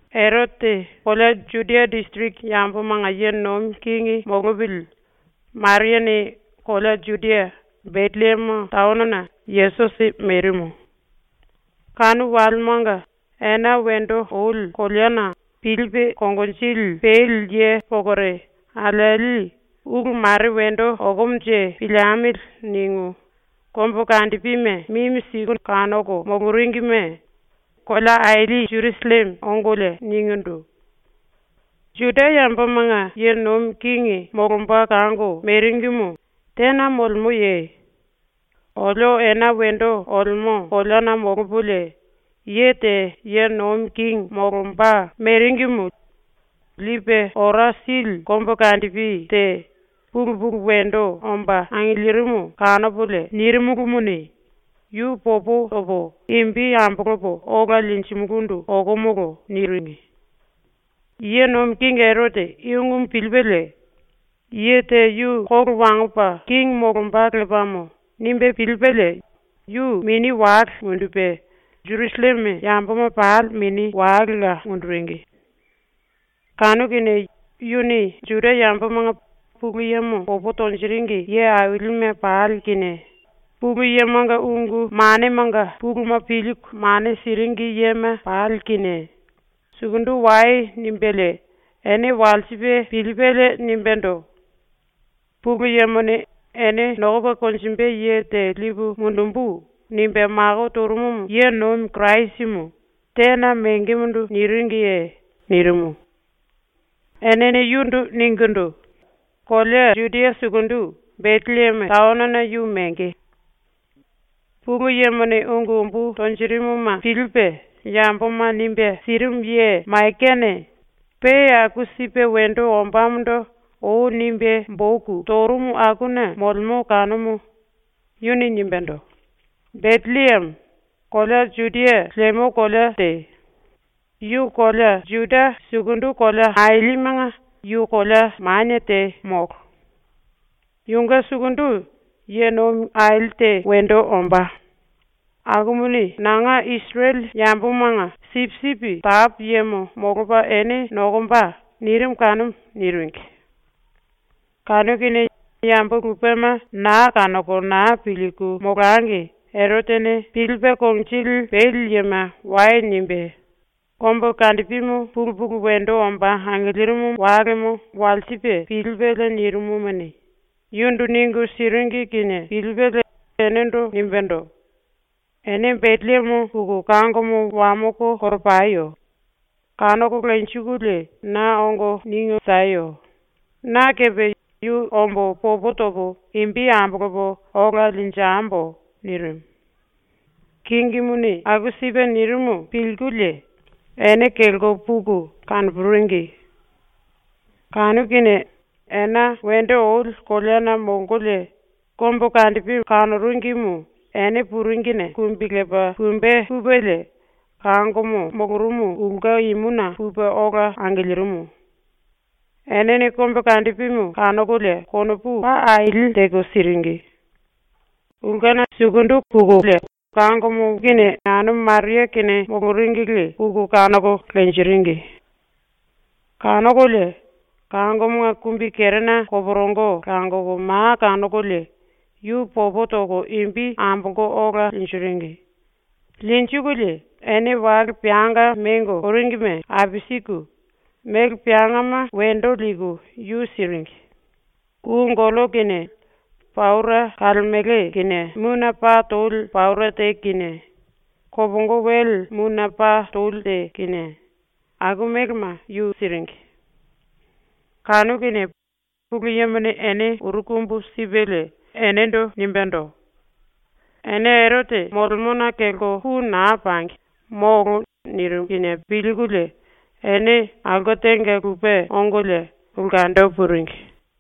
Erote kolea Judia disiriki yambomanga ye nomi kingi molopili Mariane kolea Judia, Betellieme taonona Yesusi merimu. Kanu walemanga ena wendo oli koleana pilipe konginjili peli ye pokore alieli ‘Ulu mare wendo okomonje piliemili.’ ningu kombukandipime mimi siku kanoko moloringime kolea aili Jerusalleme ongolie ningindu: “Juda yambomanga ye nomi kingi molomba kango meringimu tena molemoye? Olio ena wendo olemo koleana molopolie ye te ye nomi kingi molomba meringimu lipe ora sili kombukandipi te pulu pulu wendo omba angilirimu kanopolie nirimulumuni, yu popo topo imbi ambolopo ola linjimulundu okomolo.” niringi. Ye nomi kingi Erote i ungumu pilipelie ‘Ye te yu kolo wangopa kingi molomba lepamo.’ nimbe pilipelie yu mini wale mundupe, Jerusalleme yamboma pali mini walela munduringi. Kanu kinie yuni Juda yambomanga Pulu Yemo popo tonjiringi ye ailime pali kinie Pulu Yemonga ungu manemanga puluma pilku mane siringi yema pali kinie “Sukundu wai.” nimbelie ene walsipe pilipelie nimbendo: “Pulu Yemone “Ene nokopa konjimbe ye te lipu mundumbu.” nimbe mako torumu ye nomi Kirasimu tena mengemondo niringiye?” nirimu. Enene yundu ningindu: “Kolea Judia sukundu Betellieme taonona yu menge. Pulu Yemone ungu umbu tonjirimuma pilipe yamboma nimbe sirimu ye ⸤Maikane⸥ pe aku sipe wendo ombamondo ou nimbe boku torumu akuna molemo kanumu. Yuni nimbendo: “Betellieme, kolea Juda lemo kolea te, yu kolea Juda sukundu kolea ailimenga yu kolea manie te molo. Yunge sukundu ye nomi aili te wendo ombá, akumuni nanga Isirele yambomanga sipisipi tapu yemo molopa ene nokomba.” nirimu kanumu.” niringi. Kanu kinie yambo lupema naa kanoko naa pilku molangi Erotene pilipe konginjili peli yema “Wai.” nimbe kombukandipimu pulu pulu wendo omba angilirimu walemo walsipe pilipelie nirimumuni, yundu ningu siringi kinie pilipelie enendo nimbendo: “Ene Betellieme puku kangomo wamoko koropayo! Kanoko lenjikulie na ongo ningu sieyo. Na kepe yu ombo popo topo imbi ambolopo ola linjembo.” nirimu. Kingimuni aku sipe nirimu pilkulie ene kelko puku kanopuringi. Kanu kinie ena wendo oli koleana molkolie kombukandipi kanoringimu ene puringine kumbi lepa pumbe pupelie kangomo molorumu ulke imuna pupe ola angilirimu. Enene kombukandipimu kanokolie konopu paa aili teko siringi. Ulkena sukundu pukulie kangomo kinie anumu Maria kinie moloringili puku kanoko lenjiringi. Kanokolie kangomonga kumbikerena koporongo langoko ma kanokolie yu popo toko imbi ambolko ola linjiringi. Linjikulie ene wale peanga mengo oringime apisiku mele peangama wendo liku yu siringi. Kou gollo kinie, paura kalemele kinie mune paa toli paura te kinie, kopongo wele mune paa toli te kinie, aku melema yu siringi. Kanu kinie Pulu Yemone ene uru kumbu sipelie enendo nimbendo: “Ene Erote molemona kelko pu naa pangi, molo.” nirimu kinie pilkulie ene aulke tenga lupe ongolie ulkendo puringi.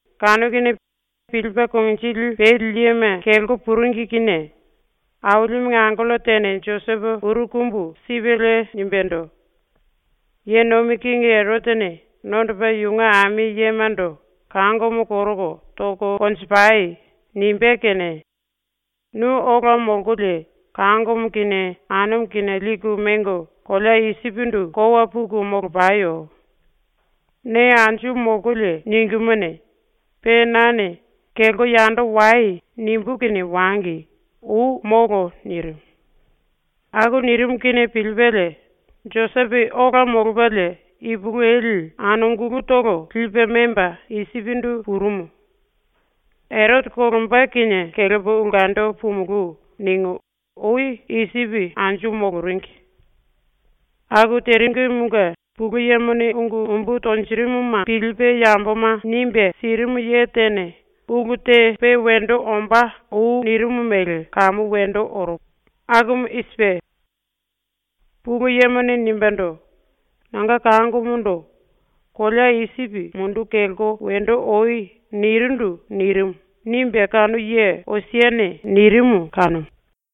Kanu kinie pilipe konginjili peli yema kelko puringi kinie Ailimunge angello tene Josepo uru kumbu sipelie nimbendo: “Ye nomi kingi Erotene nondopa yunge ami yemando “Kangomo koroko toko konjipai!” nimbé kene nu ola molkolie kangomo kinie anumu kinie liku mengo kolea Isipindu kowa puku molopayo. Ne anju molkolie ningímuni, pe nane “Kelko yando wai.” nimbú kinie wangi. Ou molo.” nirimu. Aku nirimu kinie pilipelie Josepo ola molopalie ipulueli anungulutolo lipe memba Isipindu purumu. ‘Erote kolomba kinie kelepo ulkendo pumulú.’ ningu ou Isipi anju moloringi. Aku teringimunge Pulu Yemone ungu umbu tonjirimuma pilipe yamboma nimbe sirimu ye tene ulu te pe wendo ombá ou nirimu mele kamu wendo orumu. Akumu i sipe: “Pulu Yemone nimbendo: “Nanga kangomondo “Kolea Isipi munduku kelko wendo oi.” nirindu.” nirimu.” nimbe kanu ye ⸤Osiane⸥ nirimu kanumu.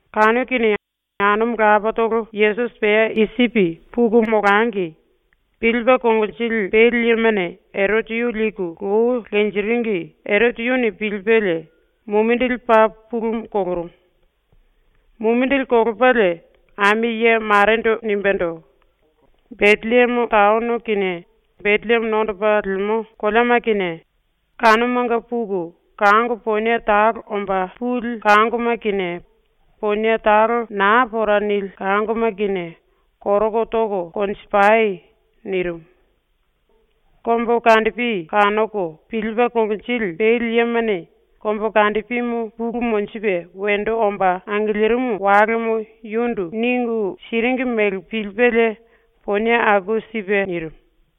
Kanu kinie anumu lapatolo Yesusi pea Isipi puku molangi, pilipe konginjili peli yemane Erote yu liku lou lenjiringi Erote yuni pilipelie mumindili paa pulumu kolorumu. Mumindili kolopalie ami ye marendo nimbendo: “Betellieme taono kinie Betellieme nondopa lemo koleama kinie kanumanga puku kango ponie talo omba puli kangoma kinie ponie talo naa pora nili kangoma kinie koroko toko konjipai!” nirimu. Kombukandipi kanoko pilipe konginjili peli yemane kombukandipimu pulu monjipe wendo omba angilirimu walemo yundu ningu siringi mele pilipelie ponie aku sipe nirimu.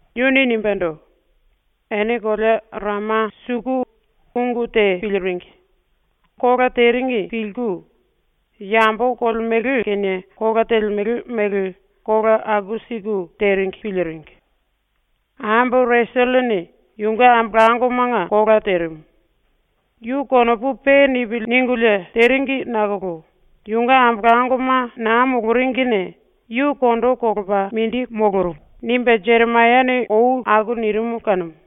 Yuni nimbendo: “Ene kolea Rama suku ungu te piliringi; kola teringi pilku, yambo kolemele kinie kola telemele mele kola aku siku teringi piliringi. Ambo Reselene yunge ambolangomanga kola terimu. Yu ‘Konopu pe nipili.’ ningulie teringi nakolo yunge ambolangoma naa moloringine yu kondo kolopa mindi molorumu.” nimbe Jeremayane ou aku nirimu kanumu.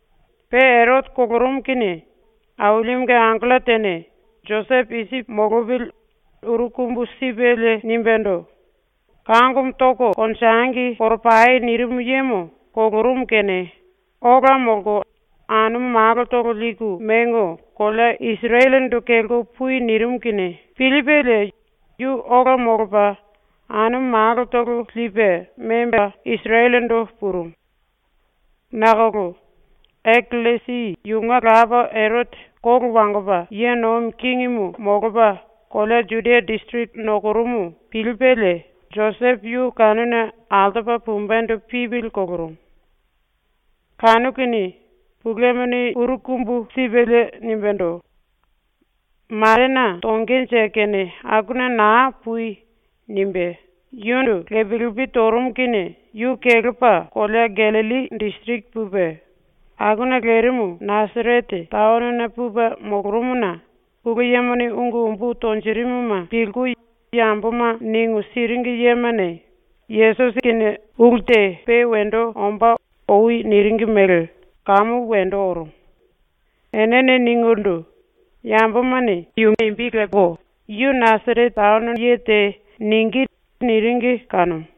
Pe Erote kolorumu kinie Ailimunge angello tene Josepo Isipi molopili uru kumbu sipelie nimbendo: “ “Kangomo toko konjengi koropai.” nirimu yemo kolorumu kene ola molko anumu malotolo liku mengo kolea Isirelendo kelko pui.” nirimu kinie pilipelie yu ola molopa anumu malotolo lipe memba Isirelendo purumu. Nakolo Akellesi yunge lapa Erote kolo wangopa ye nomi kingimu molopa kolea Judia disiriki nokorumu pilipelie Josepo yu kanuna altopa pumbendo pipili kolorumu. Kanu kinie Pulu Yemone uru kumbu sipelie nimbendo: “Marena tongenje kene akuna naa pui.” nimbe yundu lepi lepi torumu kinie yu kelepa kolea Gallilli disiriki pupe akuna lerimu Nasarete taonona pupe molorumuna Pulu Yemone ungu umbu tonjirimuma pilku yamboma ningu siringi yemane ⸤Yesusi kinie⸥ ulu te pe wendo ombá ou niringi mele kamu wendo orumu. Enene ningindu: “Yambomane “Yu Nasarete taono ye te.” ningí.” niringi kanumu.